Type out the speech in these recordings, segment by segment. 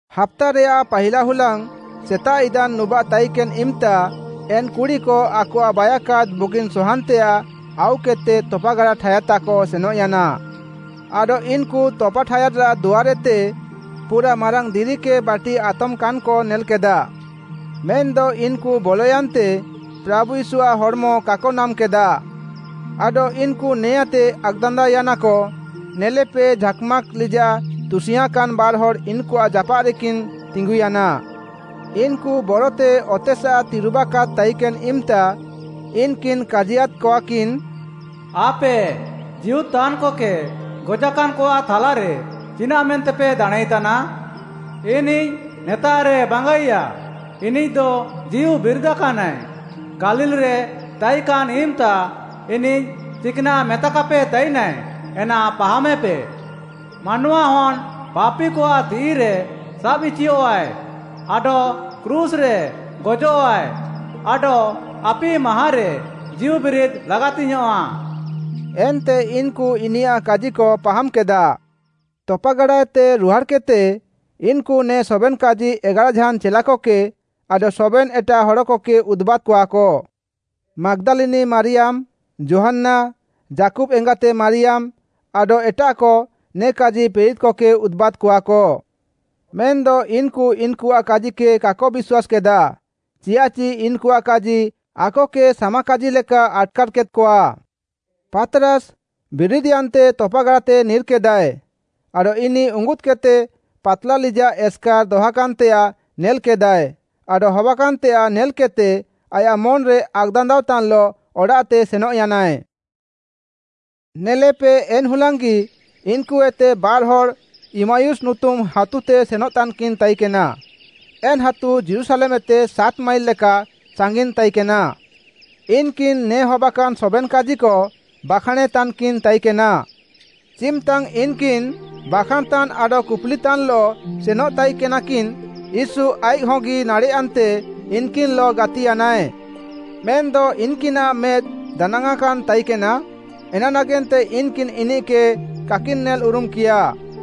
ହାପ୍ତାରେୟାଃ ପାହିଲା ହୁଲାଙ୍ଗ୍‌ ସେତାଃ ଇଦାନ୍ ନୁବାଃ ତାଇକେନ୍‌ ଇମ୍‌ତା, ଏନ୍‌ କୁଡ଼ିକ ଆକଆଃ ବାଇୟାକାଦ୍‌ ବୁଗିନ୍‌ ସହାନ୍‌ତେୟାଃ ଆଉକେଦ୍‌ତେ ତପାଗାଡ଼ା ଠାୟାଦ୍‌ତାଃକ ସେନଃୟାନା। ଆଡଃ ଇନ୍‌କୁ ତପାଠାୟାଦ୍‌ରାଃ ଦୁଆର୍‌ଏତେ ପୁରାଃ ମାରାଙ୍ଗ୍‌ ଦିରିକେ ବାଟି ଆତମାକାନ୍‌କ ନେଲ୍‌କେଦାଃ। ମେନ୍‌ଦ ଇନ୍‌କୁ ବଲୟାନ୍ତେ ପ୍ରାଭୁ ୟୀଶୁଆଃ ହଡ଼୍‌ମ କାକ ନାମ୍‌କେଦାଃ। ଆଡଃ ଇନ୍‌କୁ ନେଆଁଁତେ ଆକ୍‌ଦାନ୍ଦାଅୟାନାକ, ନେଲେପେ ଝାକ୍‌ମାକ୍‌ ଲିଜାଃ ତୁସିଙ୍ଗ୍‌ଆଁକାନ୍‌ ବାର୍‌ହଡ଼୍‌ ଇନ୍‌କୁଆଃ ଜାପାଃରେକିନ୍‌ ତିଙ୍ଗୁୟାନା। ଇନ୍‌କୁ ବରତେ ଅତେସାଃ ତିରୁବାକାଦ୍‌ ତାଇକେନ୍‌ ଇମ୍‌ତା ଇନ୍‌କିନ୍‌ କାଜିୟାଦ୍‌କଆକିନ୍‌, “‘ଆପେ ଜୀଉଦ୍‌ତାନ୍‌କକେ ଗଜାକାନ୍‌କଆଃ ଥାଲାରେ ଚିନାଃମେନ୍ତେପେ ଦାଣାଁଁଇତାନା? ଇନିଃ ନେତାଃରେ ବାଙ୍ଗାଇୟା, ଇନିଃଦ ଜୀଉବିରିଦାକାନାଏ! ଗାଲିଲ୍‌ରେ ତାଇକାନ୍‌ ଇମ୍‌ତା ଇନିଃ ଚିକ୍‌ନାଃ ମେତାକାପେ ତାଇନାଏ, ଏନା ପାହାମେପେ। ମାନୱାହନ୍‌ ପାପିକଆଃ ତିଃଇରେ ସାବ୍ଇଚିୟଃଆଏ, ଆଡଃ କ୍ରୁଶ୍‌ରେ ଗଜଃଆଏ ଆଡଃ ଆପି ମାହାଁରେ ଜୀଉବିରିଦ୍‌ ଲାଗାତିଙ୍ଗ୍‌ୟାଁଃ।’” ଏନ୍ତେ ଇନ୍‌କୁ ଇନିୟାଃ କାଜିକ ପାହାମ୍‌କେଦାଃ। ତପାଗାଡ଼ାଏତେ ରୁହାଡ଼୍‌କେଦ୍‌ତେ, ଇନ୍‌କୁ ନେ ସବେନ୍‌କାଜି ଏଗାରାଝାନ୍‌ ଚେଲାକକେ ଆଡଃ ସବେନ୍‌ ଏଟାଃ ହଡ଼କକେ ଉଦୁବାଦ୍‌କଆକ। ମାଗ୍‌ଦାଲିନି ମାରିୟାମ୍‌, ଯୋହାନ୍ନା, ଯାକୁବ୍‌ ଏଙ୍ଗାତେ ମାରିୟାମ୍‌, ଆଡଃ ଏଟାଃକ ନେ କାଜି ପ୍ରେରିତ୍‌କକେ ଉଦୁବାଦ୍‌କଆକ। ମେନ୍‌ଦ ଇନ୍‌କୁ ଇନ୍‌କୁଆଃ କାଜିକେ କାକ ବିଶ୍ୱାସ୍‌କେଦାଃ, ଚିୟାଃଚି ଇନ୍‌କୁଆଃ କାଜି ଆକକେ ସାମାକାଜିଲେକା ଆଟ୍‌କାର୍‌କେଦ୍‌କଆ। ପାତ୍‌ରାସ୍‌, ବିରିଦ୍‌ୟାନ୍ତେ ତପାଗାଡ଼ାତେ ନିର୍‌କେଦାଏ, ଆଡଃ ଇନିଃ ଉଙ୍ଗୁଦ୍‌କେଦ୍‍ତେ ପାତ୍‌ଲା ଲିଜାଃ ଏସ୍‌କାର୍‌ ଦହାକାନ୍‌ତେୟାଃ ନେଲ୍‌କେଦାଏ, ଆଡଃ ହବାକାନ୍‌ତେୟାଃ ନେଲ୍‌କେଦ୍‌ତେ ଆୟାଃ ମନ୍‌ରେ ଆକ୍‌ଦାନ୍ଦାଅ ତାନ୍‌ଲଃ ଅଡ଼ାଃତେ ସେନଃୟାନାଏ। ନେଲେପେ ଏନ୍‌ହୁଲାଙ୍ଗ୍‌ଗି ଇନ୍‌କୁଏତେ ବାର୍‌ହଡ଼୍‌ ଇମ୍ମାୟୁସ୍‌ ନୁତୁମ୍‌ ହାତୁତେ ସେନଃତାନ୍‌କିନ୍‌ ତାଇକେନା, ଏନ୍‌ ହାତୁ ଯୀରୁଶାଲେମ୍‌ଏତେ ସାତ୍‌ମାଇଲ୍‌ ଲେକା ସାଙ୍ଗିନ୍‌ ତାଇକେନା। ଇନ୍‌କିନ୍‌ ନେ ହବାକାନ୍‌ ସବେନ୍‌ କାଜିକ ବାଖାଁଣେତାନ୍‌କିନ୍‌ ତାଇକେନା। ଚିମ୍‌ତାଙ୍ଗ୍‌ ଇନ୍‌କିନ୍‌ ବାଖାଁଣ୍‌ତାନ୍‌ ଆଡଃ କୁପୁଲିତାନ୍‌ଲଃ ସେନଃତାଇକେନାକିନ୍‌ ୟୀଶୁ ଆଇଃକ୍‌ହଗି ନାଡ଼େଃୟାନ୍ତେ ଇନ୍‌କିନ୍‌ଲଃ ଗାତିୟାନାଏ। ମେନ୍‌ଦ ଇନ୍‌କିନାଃ ମେଦ୍‌ ଦାନାଙ୍ଗ୍‌କାନ୍‌ତାଇକେନା, ଏନାନାଗେନ୍ତେ ଇନ୍‌କିନ୍‌ ଇନିଃକେ କାକିନ୍‌ ନେଲ୍‌ଉରୁମ୍‌କିୟାଃ।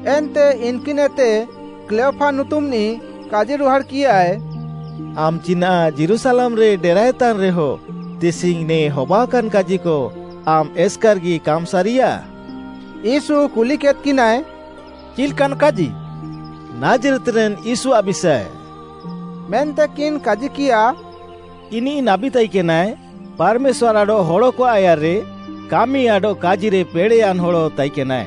ଏନ୍ତେ ଇନ୍‌କିନ୍‌ଏତେ କ୍ଲେୟପା ନୁତୁମ୍‌ନିଃ, କାଜିରୁହାଡ଼୍‌କିୟାଏ, ଆମ୍‌ ଚିନାଃ ଯୀରୁଶାଲେମ୍‌ରେ ଡେରାଏତାନ୍‌ରେହ ତିସିଙ୍ଗ୍‌ ନେ ହବାକାନ୍‌ କାଜିକ ଆମ୍‌ ଏସ୍‌କାର୍‌ଗି କାମ୍‌ ସାରିୟାଃ?” ୟୀଶୁ କୁଲିକେଦ୍‌କିନାଏ, “ଚିଲ୍‌କାନ୍‌ କାଜି?” “ନାଜ୍‌ରେତ୍‌ରେନ୍‌ ୟୀଶୁଆଃ ବିଷାଏ,” ମେନ୍ତେକିନ୍‌କାଜିକିୟାଃ। “ଇନିଃ ନାବୀ ତାଇକେନାଏ, ପାର୍‌ମେଶ୍ୱାର୍‌ ଆଡଃ ହଡ଼କଆଃ ଆୟାର୍‌ରେ କାମି ଆଡଃ କାଜିରେ ପେଡ଼େୟାନ୍‌ ହଡ଼ ତାଇକେନାଏ।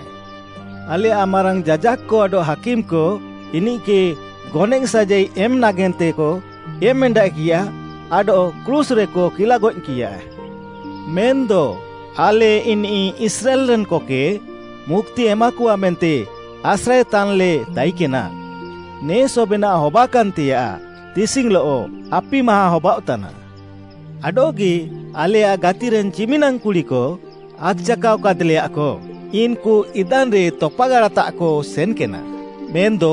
ଆଲେୟାଃ ମାରାଙ୍ଗ୍‌ ଯାଜାକ୍‌କ ଆଡଃ ହାକିମ୍‌କ ଇନିଃକେ ଗନଏଃ ସାଜାଇ ଏମ୍‌ ନାଗେନ୍ତେକ ଏମ୍‌ଏଣ୍ଡାଃକିୟାଃ ଆଡଃ କ୍ରୁଶ୍‌ରେକ କିଲାଗଏଃକିୟାଃ। ମେନ୍‌ଦ ଆଲେ ଇନିଃ ଇସ୍ରାଏଲ୍‌ରେନ୍‌କକେ ମୁକ୍ତି ଏମାକଆ ମେନ୍ତେ ଆସ୍ରାଏତାନ୍‌ଲେ ତାଇକେନା। ନେ ସବେନାଃ ହବାକାନ୍‌ତେୟାଃ ତିସିଙ୍ଗ୍‌ଲଃ ଆପି ମାହାଁ ହବାଅଃତାନା। ଆଡଃଗି ଆଲେୟାଃ ଗାତିରେନ୍‌ ଚିମିନାଙ୍ଗ୍‌ କୁଡ଼ିକ, ଆକ୍‌ଚାକାଅ କାଦ୍‌ଲେୟାକ, ଇନ୍‌କୁ ଇଦାନ୍‌ରେ ତପାଗାଡ଼ାତାଃକ ସେନ୍‌କେନା, ମେନ୍‌ଦ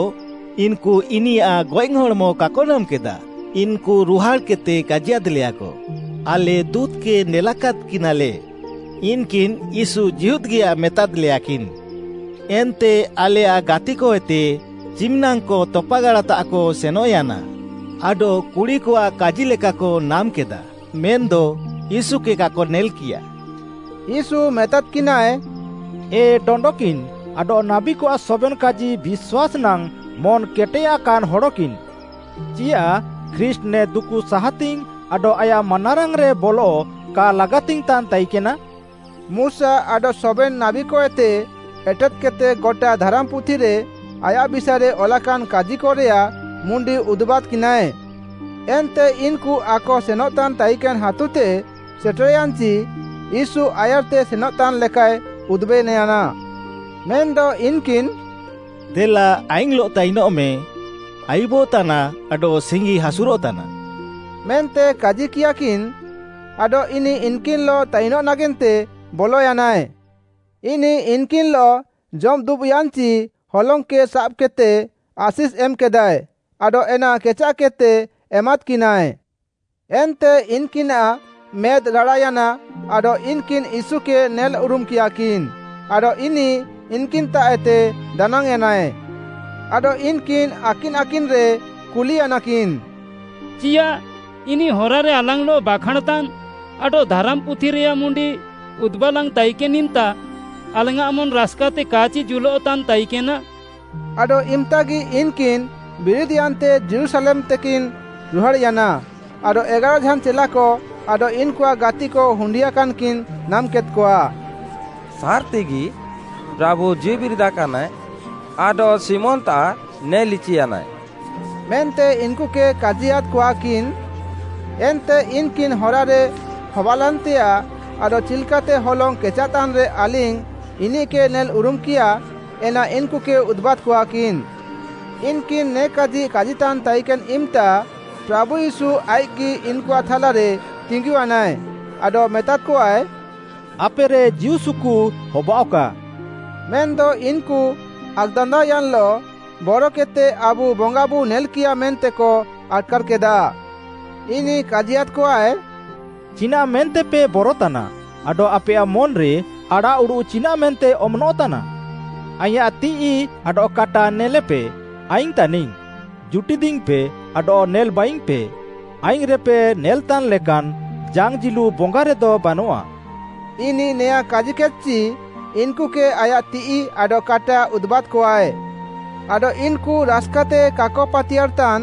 ଇନ୍‌କୁ ଇନିୟାଃ ଗଏଃହଡ଼୍‌ମ କାକ ନାମ୍‌କେଦାଃ। ଇନ୍‌କୁ ରୁହାଡ଼୍‌କେଦ୍‌ତେ କାଜିୟାଦ୍‌ଲେୟାକ, ଆଲେ ଦୁଁତ୍‌କେ ନେଲାଦ୍‌କିନାଲେ, ଇନ୍‌କିନ୍‌ ୟୀଶୁ ଜୀହୁଦ୍‌ଗିୟାଏ ମେତାଦ୍‌ଲେୟାକିନ୍‌। ଏନ୍ତେ ଆଲେୟାଃ ଗାତିକଏତେ ଚିମ୍‌ନାଙ୍ଗ୍‌କ ତପାଗାଡ଼ାତାଃକ ସେନଃୟାନା ଆଡଃ କୁଡ଼ିକଆଃ କାଜିଲେକାକ ନାମ୍‌କେଦାଃ, ମେନ୍‌ଦ ୟୀଶୁକେ କାକ ନେଲ୍‌କିୟାଃ।” ୟୀଶୁ ମେତାଦ୍‌କିନାଏ, “ଏ ଡଣ୍ଡକିନ୍‌ ଆଡଃ ନାବୀକଆଃ ସବେନ୍‌ କାଜି ବିଶ୍ୱାସ୍‌ନାଙ୍ଗ୍‌ ମନ୍‌କେଟେୟାକାନ୍‌ ହଡ଼କିନ୍‌! ଚିୟାଃ ଖ୍ରୀଷ୍ଟ୍‌ ନେ ଦୁକୁ ସାହାତିଙ୍ଗ୍‌ ଆଡଃ ଆୟାଃ ମାନାରାଙ୍ଗ୍‌ରେ ବଲ କା ଲାଗାତିଙ୍ଗ୍‌ତାନ୍‌ ତାଇକେନା?” ମୁଶା ଆଡଃ ସବେନ୍‌ ନାବୀକଏତେ ଏଟେଦ୍‌କେଦ୍‌ତେ ଗଟା ଧାରାମ୍‌ପୁଥିରେ ଆୟାଃ ବିଷାଏରେ ଅଲାକାନ୍‌ କାଜିକରେୟାଃ ମୁଣ୍ଡି ଉଦୁବାଦ୍‌କିନାଏ। ଏନ୍ତେ ଇନ୍‌କୁ ଆକସେନଃତାନ୍‌ ତାଇକେନ୍‌ ହାତୁତେ ସେଟେର୍‌ୟାନ୍‌ଚି ୟୀଶୁ ଆୟାର୍‌ତେ ସେନଃତାନ୍‌ ଲେକାଏ ଉଦୁବେନ୍‌ୟାନା। ମେନ୍‌ଦ ଇନ୍‌କିନ୍‌ “ଦେଲା ଆଲିଙ୍ଗ୍‌ଲଃ ତାଇନଃମେଁ, ଆୟୁବଃତାନା ଆଡଃ ସିଙ୍ଗିହାସୁରଃତାନା” ମେନ୍ତେ କାଜିକିୟାଃକିନ୍‌, ଆଡଃ ଇନିଃ ଇନ୍‌କିନ୍‌ଲଃ ତାଇନଃ ନାଗେନ୍ତେ ବଲୟାନାଏ। ଇନିଃ ଇନ୍‌କିନ୍‌ଲଃ ଜମ୍‌ଦୁବ୍‌ୟାନ୍‌ଚି ହଲଙ୍ଗ୍‌କେ ସାବ୍‌କେଦ୍‌ତେ, ଆଶିଷ୍‌ ଏମ୍‌କେଦାଏ, ଆଡଃ ଏନା କେଚାଃକେଦ୍‌ତେ ଏମାଦ୍‌କିନାଏ। ଏନ୍ତେ ଇନ୍‌କିନାଃ ମେଦ୍‌ ରାଡ଼ାୟାନା ଆଡଃ ଇନ୍‌କିନ୍‌ ୟୀଶୁକେ ନେଲ୍‌ଉରୁମ୍‌କିୟାକିନ୍, ଆଡଃ ଇନିଃ ଇନ୍‌କିନ୍‌ତାଃଏତେ ଦାନାଙ୍ଗ୍‌ୟାନାଏ। ଆଡଃ ଇନ୍‌କିନ୍‌ ଆକିନ୍‌ଆକିନ୍‌ରେ କୁଲିୟାନାକିନ୍‌, “ଚିୟାଃ ଇନିଃ ହରାରେ ଆଲାଙ୍ଗ୍‌ଲଃ ବାଖାଁଣ୍‌ତାନ୍‌ ଆଡଃ ଧାରାମ୍‌ପୁଥିରେୟାଃ ମୁଣ୍ଡି ଉଦୁବାଲାଙ୍ଗ୍‌ ତାଇକେନ୍‌ ଇମ୍‌ତା, ଆଲାଙ୍ଗ୍‌ଆଃ ମନ୍‌ ରାସ୍‌କାତେ କା'ଚି ଜୁଲଃତାନ୍‌ ତାଇକେନା?” ଆଡଃ ଇମ୍‌ତାଗି ଇନ୍‌କିନ୍‌ ବିରିଦ୍‌ୟାନ୍ତେ ଯୀରୁଶାଲେମ୍‌ତେକିନ୍‌ ରୁହାଡ଼୍‌ୟାନା ଆଡଃ ଏଗାରାଝାନ୍‌ ଚେଲାକ ଆଡଃ ଇନ୍‌କୁଆଃ ଗାତିକ ହୁଣ୍ଡିୟାକାନ୍‌କିନ୍‌ ନାମ୍‌କେଦ୍‌କଆ। “ସାର୍‌ତିଗି ପ୍ରାଭୁ ଜୀଉବିରିଦାକାନାଏ ଆଡଃ ଶିମୋନ୍‌ତାଃ ନେଲ୍‌ଇଚିୟାନାଏ” ମେନ୍ତେ ଇନ୍‌କୁକେ କାଜିୟାଦ୍‌କଆକିନ୍‌। ଏନ୍ତେ ଇନ୍‌କିନ୍‌ ହରାରେ ହବାଲେନ୍‌ତେୟାଃ ଆଡଃ ଚିଲ୍‌କାତେ ହଲଙ୍ଗ୍‌ କେଚାଃତାନ୍‌ରେ ଆଲିଙ୍ଗ୍‌ ଇନିଃକେ ନେଲ୍‌ଉରୁମ୍‌କିୟାଃ ଏନା ଇନ୍‌କୁକେ ଉଦୁବାଦ୍‌କଆକିନ୍‌। ଇନ୍‌କିନ୍‌ ନେ କାଜି କାଜିତାନ୍‌ ତାଇକେନ୍‌ ଇମ୍‌ତା, ପ୍ରାଭୁ ୟୀଶୁ ଆଇଃକ୍‌ଗି ଇନ୍‌କୁଆଃ ଥାଲାରେ ତିଙ୍ଗୁୟାନାଏ, ଆଡଃ ମେତାଦ୍‌କଆଏ, “ଆପେରେ ଜୀଉସୁକୁ ହବାଅଃକା।” ମେନ୍‌ଦ ଇନ୍‌କୁ ଆକ୍‌ଦାନ୍ଦାଅୟାନ୍‌ଲଃ, ବରକେଦ୍‌ତେ ଆବୁ ବଙ୍ଗାବୁ ନେଲ୍‌କିୟାଃ ମେନ୍ତେକ ଆଟ୍‌କାର୍‌କେଦାଃ। ଇନିଃ କାଜିୟାଦ୍‌କଆଏ, “ଚିନାଃମେନ୍ତେପେ ବରତାନା, ଆଡଃ ଆପେୟାଃ ମନ୍‌ରେ ଆଡ଼ାଃଉଡ଼ୁଃ ଚିନାଃମେନ୍ତେ ଅମନଃତାନା? ଆଇଁୟାଃ ତିଃଇ ଆଡଃ କାଟା ନେଲେପେ, ଆଇଙ୍ଗି ତାନିଙ୍ଗ୍‌! ଜୁଟିଦିଙ୍ଗ୍‌ପେ ଆଡଃ ନେଲ୍‌ବାଇଙ୍ଗ୍‌ପେ, ଆଇଙ୍ଗ୍‌ରେପେ ନେଲେତାନ୍‌ଲେକାନ୍‌ ଜାଙ୍ଗ୍‌ ଜିଲୁ ବଙ୍ଗାରେଦ ବାନଆଃ।” ଇନିଃ ନେଆଁଁ କାଜିକେଦ୍‌ଚି ଇନ୍‌କୁକେ ଆୟାଃ ତିଃଇ ଆଡଃ କାଟା ଉଦୁବାଦ୍‌କଆଏ। ଆଡଃ ଇନ୍‌କୁ ରାସ୍‌କାତେ କାକ ପାତିୟାର୍‌ତାନ୍‌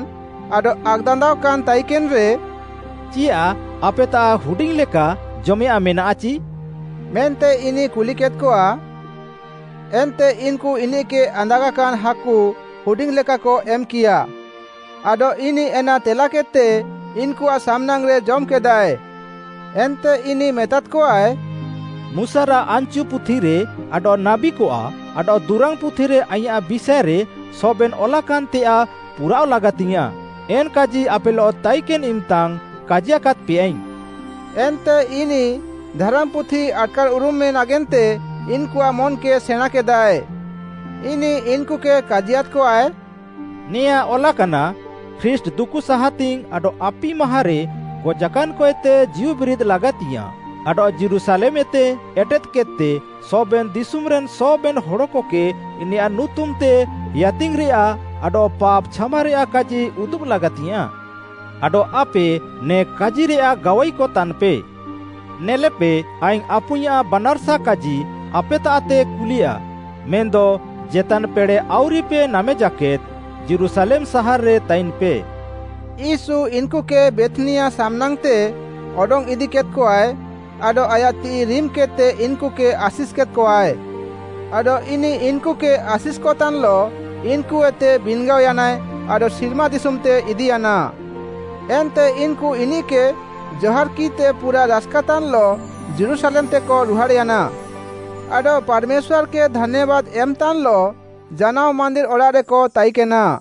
ଆଡଃ ଆକ୍‌ଦାନ୍ଦାଅକାନ୍‌ ତାଇକେନ୍‌ରେ, “ଚିୟାଃ ଆପେତାଃ ହୁଡିଙ୍ଗ୍‌ଲେକା ଜମେୟାଃଁ ମେନାଃଚି?” ମେନ୍ତେ ଇନିଃ କୁଲିକେଦ୍‌କଆଏ। ଏନ୍ତେ ଇନ୍‌କୁ ଇନିଃକେ ଆନ୍ଦାଗାକାନ୍‌ ହାକୁ ହୁଡିଙ୍ଗ୍‌ଲେକାକ ଏମ୍‌କିୟାଃ। ଆଡଃ ଇନିଃ ଏନା ତେଲାକେଦ୍‌ତେ ଇନ୍‌କୁଆଃ ସାମ୍‌ନାଙ୍ଗ୍‌ରେ ଜମ୍‌କେଦାଏ। ଏନ୍ତେ ଇନିଃ ମେତାଦ୍‌କଆଏ, ମୁଶାରାଃ ଆନ୍‌ଚୁ ପୁଥିରେ ଆଡଃ ନାବୀକଆଃ ଆଡଃ ଦୁରାଙ୍ଗ୍‌ ପୁଥିରେ ଆଇଁୟାଃ ବିଷାଏରେ ସବେନ୍‌ ଅଲାକାନ୍‌ତେୟାଃ ପୁରାଅଃ ଲାଗାତିଙ୍ଗ୍‌ୟାଁଃ, ଏନ୍‌କାଜି ଆପେଲଃ ତାଇକେନ୍‌ ଇମ୍‌ତାଙ୍ଗ୍‌ କାଜିକାଦ୍‌ପେୟାଇଙ୍ଗ୍‌। ଏନ୍ତେ ଇନିଃ ଧାରାମ୍‌ପୁଥି ଆଟ୍‌କାର୍‌ଉରୁମେଁ ନାଗେନ୍ତେ ଇନ୍‌କୁଆଃ ମନ୍‌କେ ସେଣାଁଁକେଦାଏ। ଇନିଃ ଇନ୍‌କୁକେ କାଜିୟାଦ୍‌କଆଏ, “ନେଆଁଁ ଅଲାକାନା, ଖ୍ରୀଷ୍ଟ୍‌ ଦୁକୁସାହାତିଙ୍ଗ୍‌ ଆଡଃ ଆପି ମାହାଁରେ ଗଜାକାନ୍‌କଏତେ ଜୀଉବିରିଦ୍‌ ଲାଗାତିଙ୍ଗ୍‌ୟାଁଃ, ଆଡଃ ଯୀରୁଶାଲେମ୍‌ଏତେ ଏଟେଦ୍‌କେଦ୍‌ତେ ସବେନ୍‌ ଦିଶୁମ୍‌ରେନ୍‌ ସବେନ୍‌ ହଡ଼କକେ ଇନିୟାଃ ନୁତୁମ୍‌ତେ ହେୟାତିଙ୍ଗ୍‌ରେୟାଃ ଆଡଃ ପାପ୍‌ ଛାମାରେୟାଃ କାଜି ଉଦୁବ୍‌ ଲାଗାତିଙ୍ଗ୍‌ୟାଁଃ। ଆଡଃ ଆପେ ନେ କାଜିରେୟାଃ ଗାୱାଇକ ତାନ୍‌ପେ। ନେଲେପେ ଆଇଙ୍ଗ୍‌ ଆପୁଇଁୟାଃ ବାନାର୍‌ସା କାଜି ଆପେତାଃତେ କୁଲେୟା; ମେନ୍‌ଦ ଚେତାନ୍‌ ପେଡ଼େଃ ଆଉରିପେ ନାମେଜାକେଦ୍‌ ଯୀରୁଶାଲେମ୍‌ ସାହାର୍‌ରେ ତାଇନ୍‌ପେ।” ୟୀଶୁ ଇନ୍‌କୁକେ ବେଥ୍‌ନିଆ ସାମ୍‌ନାଙ୍ଗ୍‌ତେ ଅଡଙ୍ଗ୍‌ ଇଦିକେଦ୍‌କଆଏ ଆଡଃ ଆୟାଃ ତିଃଇ ରିମ୍‌କେଦ୍‌ତେ ଇନ୍‌କୁକେ ଆଶିଷ୍‌କେଦ୍‌କଆଏ। ଆଡଃ ଇନିଃ ଇନ୍‌କୁକେ ଆଶିଷ୍‌କତାନ୍‌ଲଃ ଇନ୍‌କୁଏତେ ବିନ୍‌ଗାଅୟାନାଏ ଆଡଃ ସିର୍ମା ଦିଶୁମ୍‌ତେ ଇଦିୟାନା। ଏନ୍ତେ ଇନ୍‌କୁ ଇନିଃକେ ଜହାର୍‌କିଃତେ ପୁରାଃ ରାସ୍‌କାତାନ୍‌ଲଃ ଯୀରୁଶାଲେମ୍‌ତେକ ରୁହାଡ଼୍‌ୟାନା। ଆଡଃ ପାର୍‌ମେଶ୍ୱାର୍‌କେ ଧାନ୍ୟାବାଦ୍‌ ଏମ୍‌ତାନ୍‌ଲଃ ଜାନାଅ ମାନ୍ଦିର୍‌ଅଡ଼ାଃରେକ ତାଇକେନା।